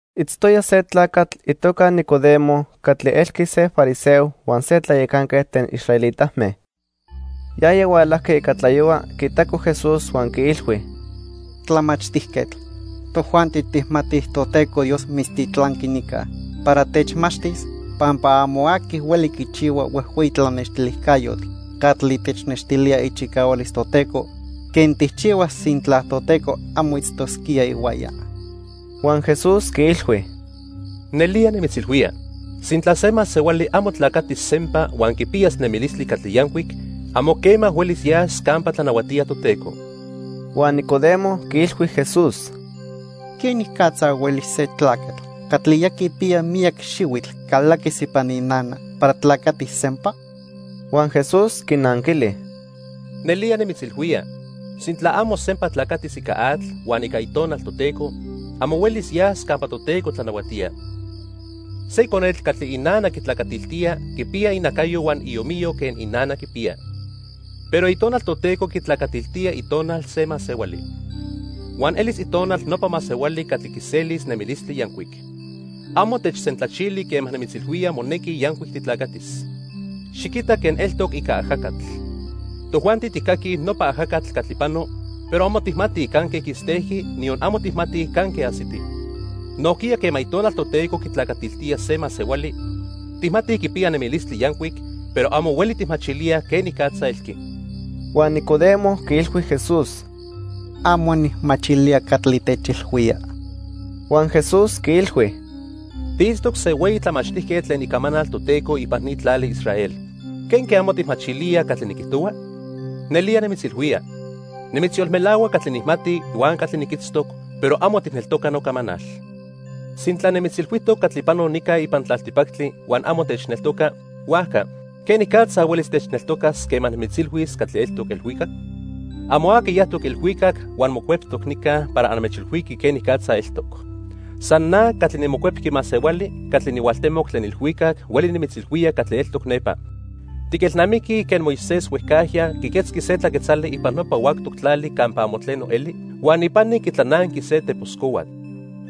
Itztoya se tlacatl itoca Nicodemo catli elqui se fariseo huan se tlayacanquetl tlen israelitame. Yaya hualajqui ica tlayohua quiitaco Jesús huan quiilhui: —Tlamachtijquetl, tojuanti tijmatij Toteco Dios mitztitlanqui nica para techmachtis pampa amo aqui hueli quichihua huejhueyi tlanextilijcayotl catli technextilía ichicahualis Toteco quen tijchihua sintla Toteco amo itztosquía ihuaya. Huan Jesús quiilhui: —Nelía nimitzilhuía, sintla se masehuali amo tlacatis sempa huan quipiyas nemilistli catli yancuic, amo quema huelis yas campa tlanahuatía Toteco. Huan Nicodemo quiilhui Jesús: —¿Quenicatza hueli se tlacatl catli ya quipiya miyac xihuitl calaquis ipan inana para tlacatis sempa? Huan Jesús quinanquili: —Nelía nimitzilhuía, sintla amo sempa tlacatis ica atl huan ica Itonal Toteco, amo huelis yas campa Toteco tlanahuatía. Se conetl catli inana quitlacatiltía quipiya inacayo huan iomiyo quen inana quipiya. Pero Itonal Toteco quitlacatiltía itonal se masehuali. Huan elis itonal nopa masehuali catli quiselis nemilistli yancuic. Amo techsentlachili quema nimitzilhuía monequi yancuic titlacatis. Xiquita quen eltoc ica ajacatl. Tojuanti tijcaquij nopa ajacatl catli pano, pero amo tijmatij canque quistejqui, niyon amo tijmatij canque ajsiti. Nojquiya quema Itonal Toteco quitlacatiltía se masehuali, tijmatij quipiya nemilistli yancuic, pero amo hueli tijmachilíaj quenicatza elqui. Huan Nicodemo quiilhui Jesús: —Amo nijmachilía catli techilhuía. Huan Jesús quiilhui: —Tiitztoc se hueyi tlamachtijquetl tlen Icamanal Toteco ipan ni tlali Israel. ¿Quenque amo tijmachilía catli niquijtohua? Nelía nimitzilhuía, nimitzyolmelahua catli nijmati huan catli niquitztoc, pero amo tijneltoca nocamanal. Sintla nimitzilhuijtoc catli pano nica ipan tlaltipactli huan amo techneltoca, huajca ¿quenicatza huelis techneltocas quema nimitzilhuis catli eltoc ilhuicac? "Amo aqui yajtoc ilhuicac huan mocueptoc nica para anmechilhuiqui quenicatza eltoc. San na catli niMocuepqui Masehuali catli nihualtemoc tlen ilhuicac hueli nimitzilhuía catli eltoc nepa. Tiquelnamiquij quen Moisés huejcajya quiquetzqui se tlaquetzali ipan nopa huactoc tlali campa amo tleno eli huan ipani quitlananqui se tepos cohuatl.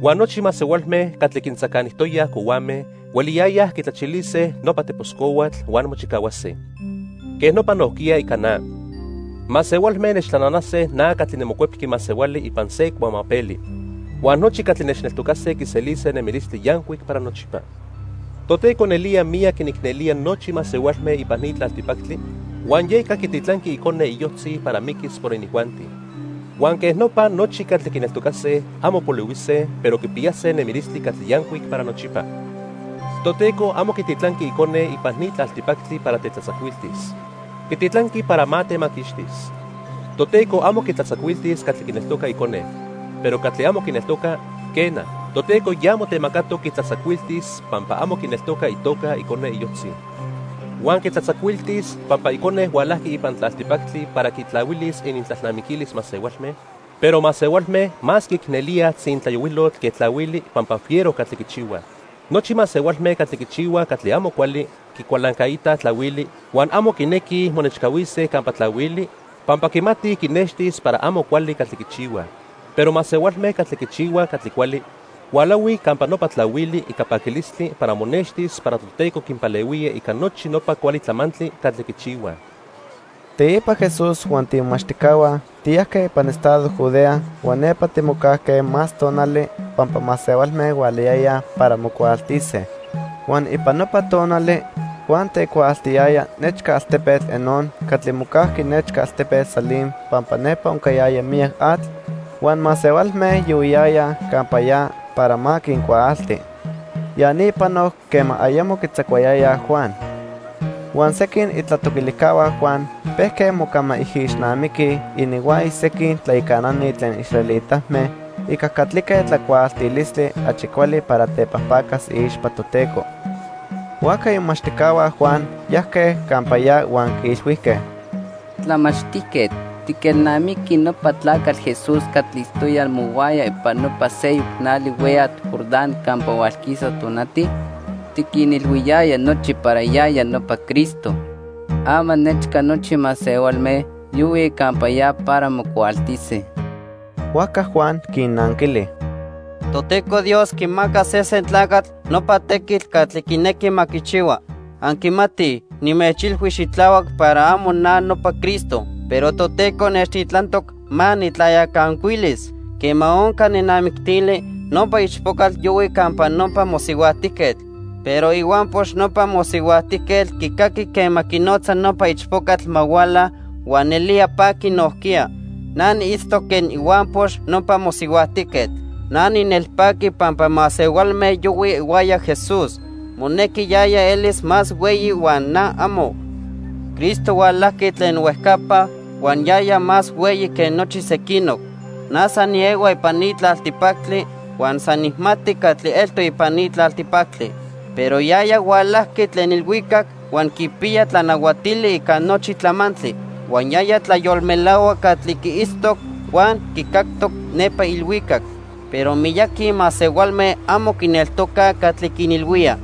Huan nochi masehualme catli quintzacanijtoyaj cohuame hueliyayaj quitlachilise nopa tepos cohuatl huan mochicahuase. Quej nopa nojquiya ica na. Masehualme nechtlananase na catli niMocuepqui Masehuali ipan se cuamapeli. Huan nochi catli nechneltocase quiselise nemilistli yancuic para nochipa." Toteco nelía miyac quinicnelía nochi masehualme ipan ni tlaltipactli, huan yeca quititlanqui Icone iyojtzi para miquis por inijuanti. Huan quej nopa nochi catli quineltocase, amo polihuise, pero quipiyase nemilistli catli yancuic para nochipa. Toteco amo quititlanqui Icone ipan ni tlaltipactli para tetlatzacuiltis. Quititlanqui para ma temaquixtis. Toteco amo quitlatzacuiltis catli quineltoca Icone. Pero catli amo quineltoca, quena, Toteco ya motemacatoc quitlatzacuiltis pampa amo quineltoca itoca Icone iyojtzi. Huan quitlatzacuiltis pampa Icone hualajqui ipan tlaltipactli para quitlahuilis inintlalnamiquilis masehualme, pero masehualme más quiicnelíaj tzintlayohuilotl que tlahuili pampa fiero catli quichihuaj. Nochi masehualme catli quichihuaj catli amo cuali quicualancaitaj tlahuili huan amo quinequij monechcahuise campa tlahuili pampa quimatij quinextis para amo cuali catli quichihuaj. Pero masehualme catli quichihuaj catli cuali, hualahuij campa nopa tlahuili ica paquilistli para monextis para Toteco quinpalehuía ica nochi nopa cuali tlamantli catli quichihuaj. Teipa Jesús huan tiimomachtijcahua tiyajque ipan estado Judea huan nepa timocajque más tonali pampa masehualme hualayayaj para mocuaaltise. Huan ipan nopa tonali Juan tecuaaltiyaya nechca altepetl Enón catli mocajqui nechca altepetl Salim pampa nepa oncayaya miyac atl, huan masehualme yohuiyayaj campa ya para ma quincuaalti. Ya ni panoc quema ayamo quitzacuayayaj Juan. Huan sequin itlatoquilijcahua Juan pejque mocamaijixnamiquij ininhuaya sequin tlayacanani tlen israelitame ica catlique tlacuaaltilistli achi cuali para tepajpacas iixpa Toteco. Huajca imomachtijcahua Juan yajque campa ya huan quiilhuijque: —Tlamachtijquetl, ¿tiquelnamiqui nopa tlacatl Jesús catli itztoya mohuaya ipan nopa seyoc nali hueyatl Jordán campa hualquisa tonati? Tiquinilhuiyaya nochi para yaya nopa Cristo. Ama nechca nochi masehualme yohuij campa ya para mocuaaltise. Huajca Juan quinnanquili: —Toteco Dios quimaca sesen tlacatl nopa tequitl catli quinequi ma quichihua. Anquimatij nimechilhui xitlahuac para amo na nopa Cristo, pero Toteco nechtitlantoc ma nijtlayacancuilis. Quema onca nenamictili, nopa ichpocatl yohui campa nopa mosihuajtijquetl, pero ihuampox nopa mosihuajtijquetl quicaqui quema quinotza nopa ichpocatl ma huala, huan nelía paqui nojquiya. Na niitztoc quen ihuampox nopa mosihuajtijquetl. Na ninelpaqui pampa masehualme yohuij ihuaya Jesús. Monequi yaya elis más hueyi huan na, amo. "Cristo hualajqui tlen huejcapa huan yaya más hueyi que nochi sequinoc. Na san niehua ipan ni tlaltipactli huan san nijmati catli eltoc ipan ni tlaltipactli. Pero yaya hualajqui tlen ilhuicac huan quipiya tlanahuatili ica nochi tlamantli. Huan yaya tlayolmelahua catli quiitztoc huan quicactoc nepa ilhuicac, pero miyaqui masehualme amo quineltocaj catli quinilhuía.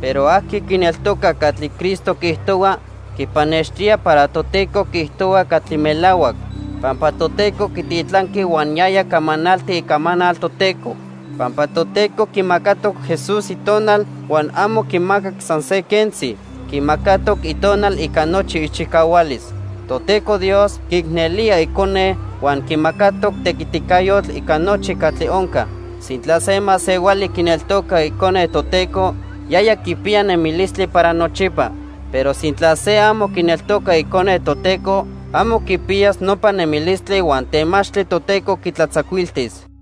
Pero aqui quineltoca catli Cristo quiijtohua, quipannextía para Toteco quiijtohua catli melahuac, pampa Toteco quititlanqui huan yaya camanalti icamanal Toteco. Pampa Toteco quimacatoc Jesús Itonal huan amo quimacac san se quentzi. Quimacatoc Itonal ica nochi ichicahualis. Toteco Dios quiicnelía Icone huan quimacatoc tequiticayotl ica nochi catli onca. Sintla se masehuali quineltoca Icone Toteco, yaya quipiya nemilistli para nochipa. Pero sintla se amo quineltoca Icone Toteco, amo quipiyas nopa nemilistli huan temachtli Toteco quitlatzacuiltis."